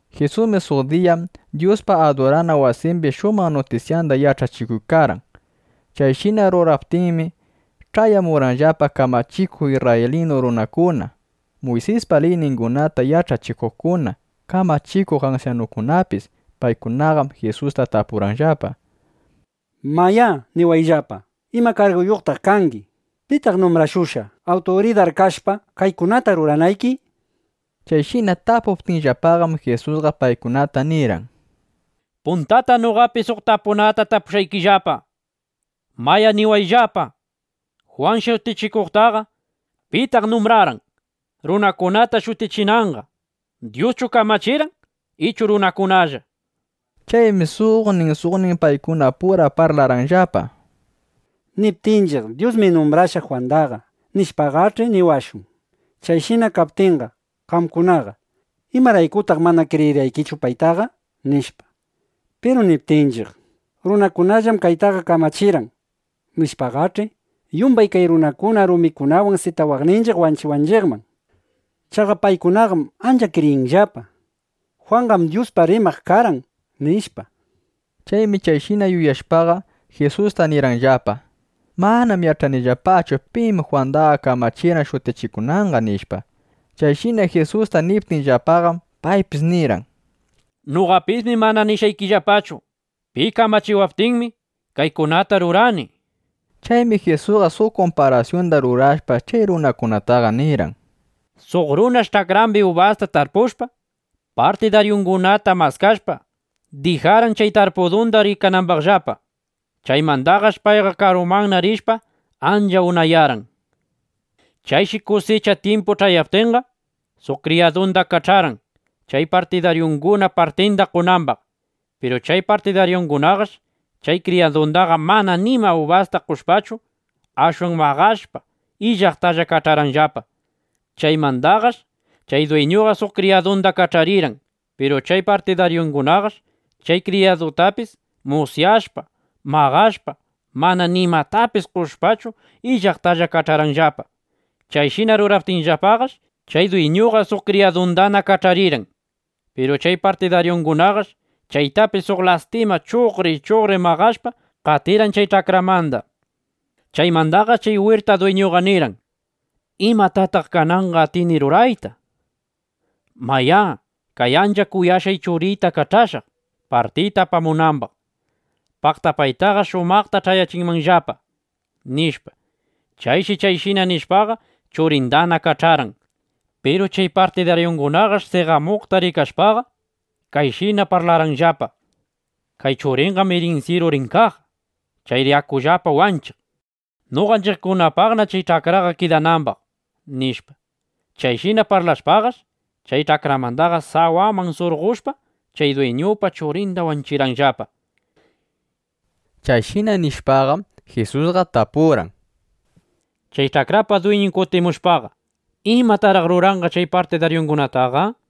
Jisusmi suq diyam Dyuspa adurana wasimbi shumaq nutisyanda yach'achikuykarqan. Chayshina ruraykaptinmi, ch'ayamurqanllapa kamachikuq isrraylinu kurakuna, Muysispa liyningunata yach'achikuqkuna, kamachikuq ansyanukunapis. Paykunaqam Jisusta tapurqanllapa: —Mayá, niwayllapa. ¿Ima karguyuqtaq kangi? ¿Pitaq numbrashushqa, awturidar kashpa, kaykunata ruranayki? Chayshina tapuptinllapaqam, Jisusqa paykunata nirqan: —Puntata noqapis suq tapunata tapushqaykillapa. Mayá, niwayllapa: Jwan Shutichikuqtaqa ¿pitaq numbrarqan, runakunata shutichinanqa? ¿Dyuschu kamachirqan, ichu runakunalla? nishpa. Chaymi suqnin suqnin paykunapura parlarqanllapa: —Niptinchiq: “Dyusmi numbrarqan Jwandaqa”, nishpaqach'i, niwashun: “Chayshina kaptinqa, qamkunaqa ¿imaraykutaq mana kriyirqaykichu paytaqa?” nishpa. Piru niptinchiq: “Runakunallam paytaqa kamachirqan”, nishpaqach'i, yumbay kay runakuna rumikunawan sitawaqninchiq wanchiwanchiqman. Chaqa paykunaqam ancha kriyinllapa: “Jwanqam Dyuspaq rimaq karqan”, nishpa. Chaymi chayshina yuyashpaqa, Jisusta nirqanllapa: —Manam yach'anillapachu: Pim Jwandaqa kamachirqan shutichikunanqa, nishpa. Chayshina Jisusta niptinllapaqam, paypis nirqan: —Noqapismi mana nishqaykillapachu pi kamachiwaptinmi, kaykunata rurani, nishpa. Chaymi Jisusqa suq kumparasyunda rurashpa, chay runakunata nirqan: —Suq runash ch'akrambi ubasta tarpushpa, partidaryukunata maskashpa, dijarqan chay tarpudunda rikanambaqllapa. Chaymandaqash payqa karuman rishpa, ancha unayarqan. Chayshi kusicha tyimpu ch'ayaptinqa, suq kriyadunda kach'arqan, chay partidaryunguna partinda qonambaq. Piru chay partidaryungunaqash chay kriyadundaqa mana nima ubasta qoshpachu, ashwan maqashpa, illaqtalla kach'arqanllapa. Chaymandaqash chay dwiñuqa suq kriyadunda kach'arirqan. Piru chay partidaryungunaqash chay kriyadutapis musyashpa, maqashpa, mana nimatapis qoshpachu, illaqtalla kach'arqanllapa. Chayshina ruraptinllapaqash, chay dwiñuqa suq kriyadundana kach'arirqan. Piru chay partidaryungunaqash chaytapis suq lastima chuqri chuqri maqashpa, qatirqan chay ch'akramanda. ’Chaymandaqash chay wirta dwiñuqa nirqan: “¿Imatataq kananqa atini rurayta? Mayá, kay ancha kuyashqay churiyta kach'ashaq, partiyta apamunambaq. Paqta paytaqa shumaqta ch'ayachinqallapa”, nishpa. Chayshi chayshina nishpaqa, churindana kach'arqan. Piru chay partidaryungunaqash seqamuqta rikashpaqa, kayshina parlarqanllapa: “Kay churinqam irinsyiru rin kaq. Chayri akullapa wanchiq, noqanchiqpaqna kay ch'akra kidanambaq”, nishpa. Chayshina parlashpaqash, chay ch'akramanda sawaman surqoshpa, chay dwiñupa churinda wanchirqanllapa. Chayshina nishpaqam, Jisusqa tapurqan: —Chay ch'akrapa dwiñun kutimushpaqa, ¿imataraq ruranqa chay partidaryungunataqa? nishpa.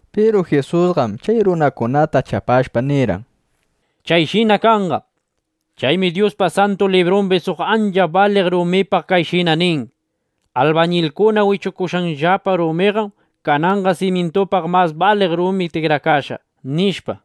Piru Jisusqam chay runakunata chapashpa nirqan: —Chayshina kanqa. Chaymi Dyuspa Santu Librumbi suq ancha baliq rumipaq kayshina nin: Albañilkuna wichukushqanllapa rumiqam kananqa simyintupa mas baliq rumin tikrakashqa, nishpa.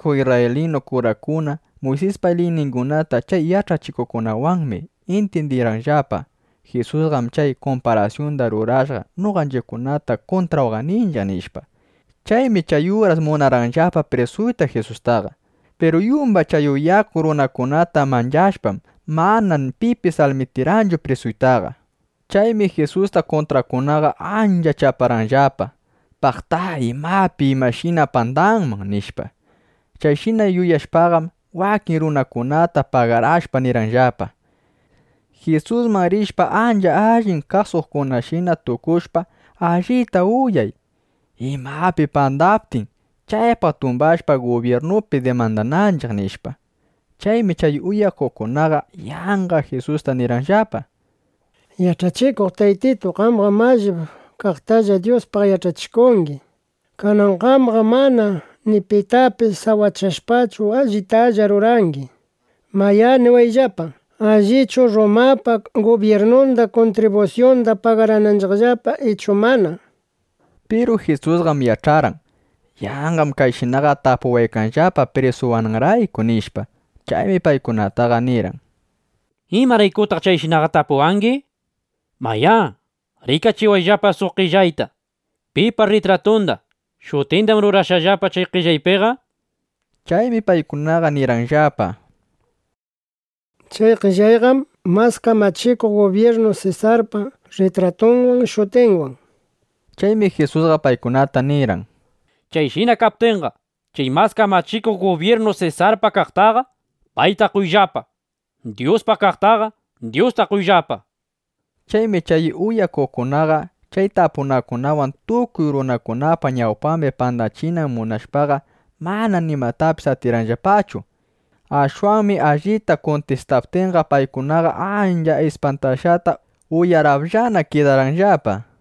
Chay kamachikuq isrraylinu kurakuna, Muysispa liyningunata chay yach'achikuqkunawanmi intyindirqanllapa: Jisusqam chay kumparasyundaqa rurashqa, noqanchiqkunata kuntrawaqninchiq, nishpa. Chaymi chay uras munarqanllapa prisuyta Jisustaqa. Piru yumbay chay uyakuq runakunata manchashpam, mana pipis almitikarqanchu prisuytaqa. Chaymi Jisusta kuntraqkunaqa ancha chaparqanllapa, paqta imapi imashina pandanman, nishpa. Chayshina yuyashpaqam, wakin runakunata pagarashpa nirqanllapa: —Jisusman rishpa, ancha allin kasuqkunashina tukushpa, allita uyay, imapi pandaptin, chaypaq tumbashpa, gubyirnupi dimandananchiq, nishpa. Chaymi chay uyakuqkunaqa yanqa Jisusta nirqanllapa: —Yach'achikuq Taytitu, qamqam allip kaqtalla Dyuspaq yach'achikungi. Kanan qamqam mana ni pitapis sawachashpachu, allitalla rurangi. Mayá, niwayllapa, ¿allichu Rrumapa gubyirnunda kuntribusyunda pagarananchiqllapa ichu mana? nishpa. Piru Jisusqam yach'arqan: Yanqam chayshinaqa tapuwaykanllapa prisuwananrayku, nishpa. Chaymi paykunataqa nirqan: —¿Imaraykutaq chayshinaqa tapuwangi? Mayá, rikachiwayllapa suq qellayta. ¿Pipa rritratunda, shutindam rurashqallapa chay qellaypiqa? nishpa. Chaymi paykunaqa nirqanllapa: —Chay qellayqam mas kamachikuq gubyirnu Sesarpa rritratunwan, shutinwan, nishpa. Chaymi Jisusqa paykunata nirqan: —Chayshina kaptinqa, chay mas kamachikuq gubyirnu Sesarpa kaqtaqa, payta qoyllapa. Dyuspa kaqtaqa, Dyusta qoyllapa, nishpa. Chaymi chay uyakuqkunaqa, chay tapunakunawan tukuy runakunapa ñawpambi pandachiyta munashpaqa, mana nimatapis atirqanllapachu. Ashwanmi allita kuntistaptinqa, paykunaqa ancha ispantashqata, uyarapllana (uyarallana) kidarqanllapa.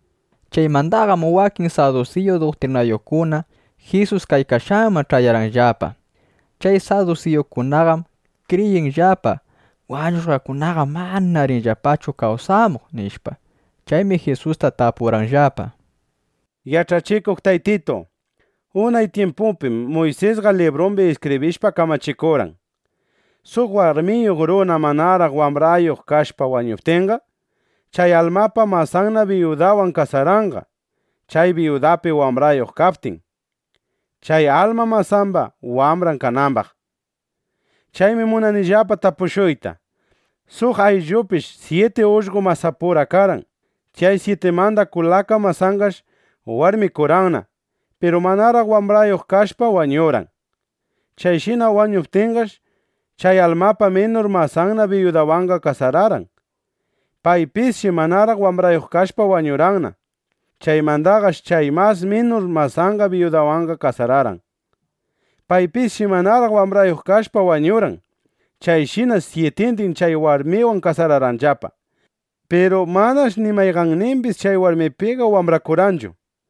Chaymandaqam wakin sadusiyu duktrinayuqkuna Jisus kaykashqanman ch'ayarqanllapa. Chay sadusiyukunaqam kriyinllapa: Wañushqakunaqam mana rinllapachu kawsamuq, nishpa. Chaymi Jisusta tapurqanllapa: —Yach'achikuq Taytitu, (unay tyimpupim) Muysisqa librumbi iskibrishpa, kamachikurqan, suq warmiyuq runa manaraq wambrayuq kashpa wañuptinqa, chay almapa masanna biyudawan kasaranqa, chay biyudapi wambrayuq kaptin, chay alma masamba wambran kanambaq. Chaymi munanillapa tapushuyta: Suq ayllupish syiti ullqo masapura karqan. Chay syitimanda kulaka masanqash warmikurqanna. Piru manaraq wambrayuq kashpash wañurqan. Chayshina wañuptinqash, chay almapa minur masanna biyudawanqa kasararqan. Paypisshi manaraq wambrayuq kashpa wañurqanna. Chaymandaqash chay mas minur masanna biyudawanqa kasararqan. Paypisshi manaraq wambrayuq kashpa wañurqan. Chayshinash syitindin chay warmiwan kasararqanllapa. Piru manash ni mayqannimbis chay warmipiqa wambrakurqanchu.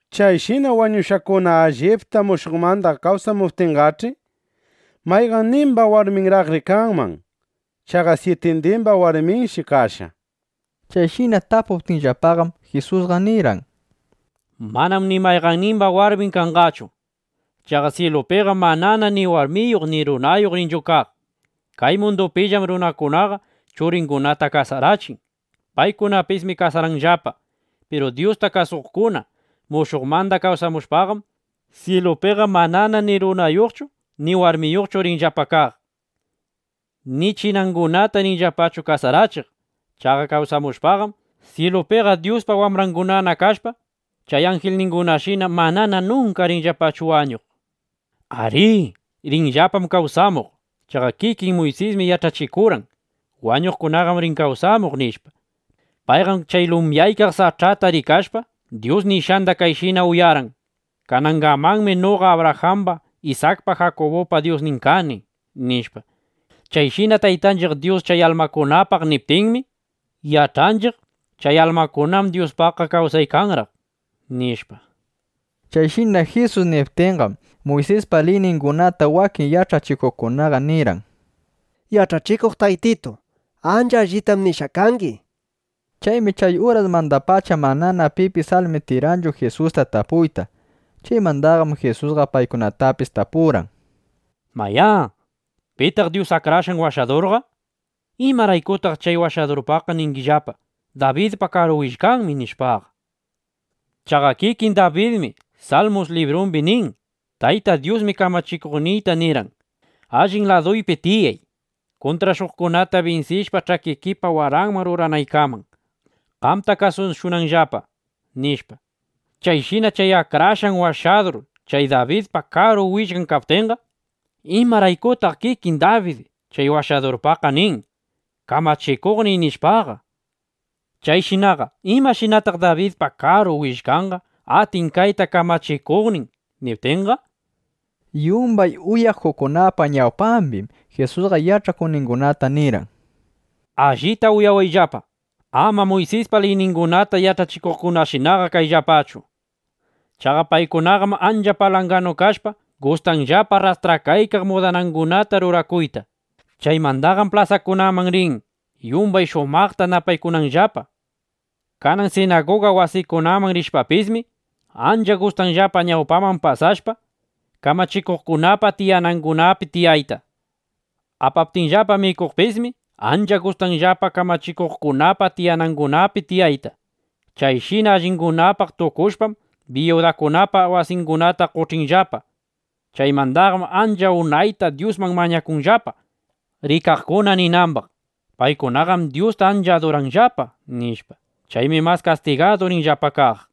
Chayshina wañushqakuna allipta mushuqmanda kawsamuptinqach'i, ¿mayqannimba warminnaraqri kanman? Chaqa syitindimba warminshi kashqa, nishpa. Chayshina tapuptinllapaqam, Jisusqa nirqan: —Manam ni mayqannimba warmin kanqachu. Chaqa syilupiqam manana ni warmiyuq ni runayuq rinchu kaq. Kay mundupillam runakunaqa churingunata kasarachin. Paykunapismi kasaranllapa. Piru Dyusta kasuqkuna mushuqmanda kawsamushpaqam, syilupiqa manana ni runayuqchu ni warmiyuqchu rinllapa kaq; ni chinangunata rinllapachu kasarachiq. Chaqa kawsamushpaqam, syilupiqa Dyuspa wambrangunana kashpa, chay anjilningunashina manana nunka rinllapachu wañuq. Arí, rinllapam kawsamuq. Chaqa kikin Muysismi yach'achikurqan: Wañuqkunam rin kawsamuq, nishpa. Payqam chay lumyaykaq sach'ata rikashpa, Dyus nishqanda kayshina uyarqan: “Kanangamanmi noqa Abrajamba, Isakpa, Jakubupa Dyusnin kani”, nishpa. Chayshina Taytanchiq Dyus chay almakunapaq niptinmi, yach'anchiq: Chay almakunam Dyuspaq kawsaykanraq, nishpa. Chayshina Jisus niptinqam, Muysispa liyningunata wakin yach'achikuqkunaqa nirqan: —Yach'achikuq Taytitu, ancha allitam nishqa kangi, nishpa. Chaymi chay urasmandapacha manana pipis almitikarqanchu Jisusta tapuyta. Chaymandaqam Jisusqa paykunatapis tapurqan: —Mayá, ¿pitaq Dyus Akrashqan Washadurqa? ¿Imaraykutaq chay Washadurpaqqa ningillapa: “Dabidpa karu willkanmi”, nishpaqa? Chaqa kikin Dabidmi Salmus librumbi nin: Tayta Dyusmi Kamachikuqniyta nirqan: “Allin laduypi tiyay, kuntrashuqkunata binsishpa, ch'akikipa waranman ruranaykaman (qamta kasushunanllapa)”, nishpa. Chayshina chay Akrashqan Washadur chay Dabidpa karu willkan kaptinqa, ¿imaraykutaq kikin Dabid chay Washadurpaqqa nin: “Kamachikuqniy”, nishpaqa? Chayshinaqa ¿imashinataq Dabidpa karu willkanqa atin kayta, Kamachikuqnin niptinqa? Yumbay uyakuqkunapa ñawpambim Jisusqa yach'akuqningunata nirqan: —Allita uyawayllapa, ama Muysispa liyningunata yach'achikuqkunashinaqa kayllapachu. Chaqa paykunaqam ancha palanganu kashpa, gustanllapa rrastrakaykaq mudanangunata rurakuyta. Chaymandaqam plasakunaman rin, yumbay shumaqta napaykunanllapa. Kanan sinaguga wasikunaman rishpapismi, ancha gustanllapa ñawpaman pasashpa, kamachikuqkunapa tiyanangunapi tiyayta. Apaptinllapa mikuqpismi, ancha gustanllapa kamachikuqkunapa tiyanangunapi tiyayta. Chayshina allingunapaq tukushpam, biyudakunapa wasingunata qoch'inllapa. Chaymandaqam ancha unayta Dyusman mañakunllapa, rikaqkuna ninambaq: “Paykunaqam Dyusta ancha aduranllapa”, nishpa. Chaymi mas kastigadu rinllapa kaq.